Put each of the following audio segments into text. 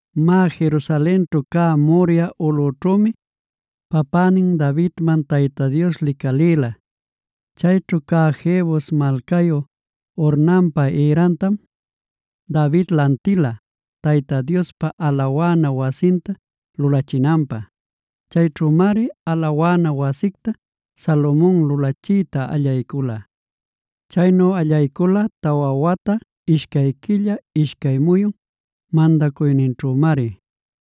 Má, Jerusalenćhu cä Moriah ulꞌućhümi papänin Davidman Tayta Dios licalïla. Chayćhu cä Jebus malcayu Ornanpaa ïrantam, David lantila Tayta Diospa alawana wasinta lulachinanpä. Chayćhümari alawana wasicta Salomon lulachiyta allaycula. Chaynu allaycula tawa wata, ishcay quilla, ishcay muyun mandacuyninćhümari.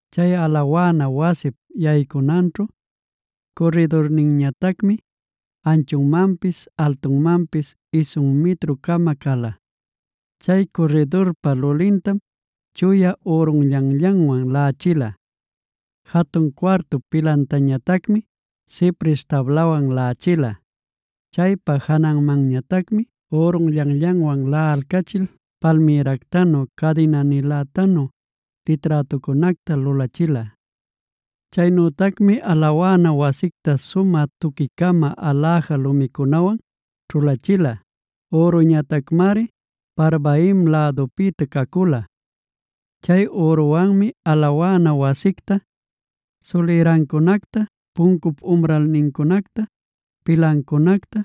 Chay alawana wasip yaycunanćhu curridurninñatacmi anchunmanpis altunmanpis isun mitru-cama cala.b Chay curridurpa lulintam chuya ürunllanllanwan laꞌachila. Jatun cuartup pilantañatacmi cipres tablawan laꞌachila. Chaypa jananmanñatacmi ürunllanllanwan laꞌalcachil palmïractanu cadina-nilätanu liträtucunacta lulachila. Chaynütacmi alawana wasicta sumä tuqui-cama aläja lumicunawan ćhulachila. Üruñatacmari Parvaim lädupïta cacula. Chay üruwanmi alawana wasicta, sulïrancunacta, puncup umralnincunacta, pilancunacta,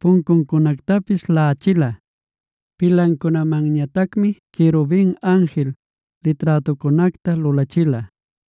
puncuncunactapis laꞌachila. Pilancunamanñatacmi querubin anjil liträtucunacta lulachila.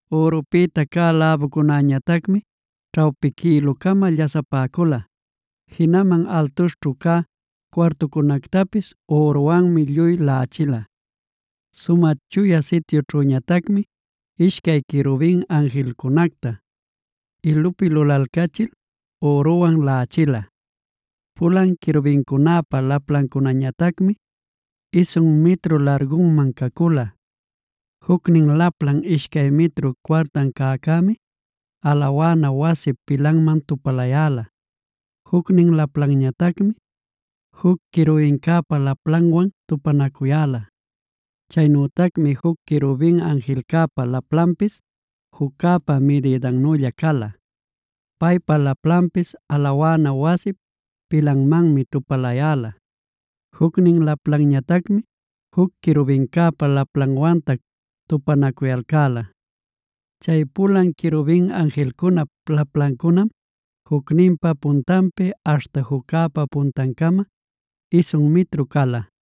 Ürupïta cä läbucunäñatacmi ćhawpi quïlu-cama llasapäcula. Jinaman altuśhćhu cä cuartucunactapis üruwanmi lluy laꞌachila. Sumä Chuya Sityućhüñatacmi ishcay querubin anjilcunacta ilupi lulalcachil üruwan laꞌachila. Pulan querubincunäpa laplancunañatacmi isun mitru largunman cacula. Jucnin laplan ishcay mitru cuartan cäcämi, alawana wasip pilanman tupalayäla. Jucnin laplanñatacmi juc querubincäpa laplanwan tupanacuyäla. Chaynütacmi juc querubin anjilcäpa laplanpis, juccäpa midïdannülla cala. Paypa laplanpis alawana wasip pilanmanmi tupalayäla. Jucnin laplanñatacmi juc querubincäpa laplanwantac tupanacuyalcäla. Chay pulan querubin anjilcunap laplancunam, jucninpa puntanpi aśhta juccäpa puntancama isun mitru cala.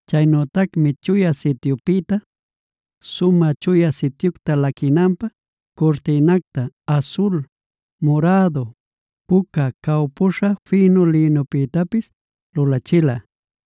Chaynütacmi Chuya Sityupïta, Sumä Chuya Sityucta laquinanpä curtïnacta asul, murädu, puca cawpüśha fïnu lïnupïtapis lulachila.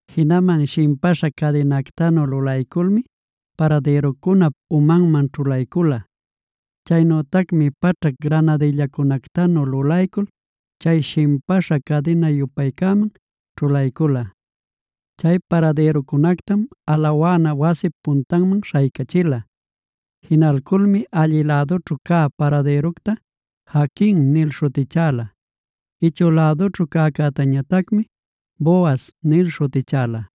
Jinaman shimpäśha cadinactanu lulayculmi paradïrucunap umanman ćhulaycula. Chaynütacmi paćhac granadillacunactanu lulaycul chay shimpäśha cadina-yupaycäman ćhulaycula. Chay paradïrucunactam alawana wasip puntanman śhaycachila. Jinalculmi allï lädućhu cä paradïructa Jaquing nil śhutichäla; ichü lädućhu cäcätañatacmi Boazh nil śhutichäla.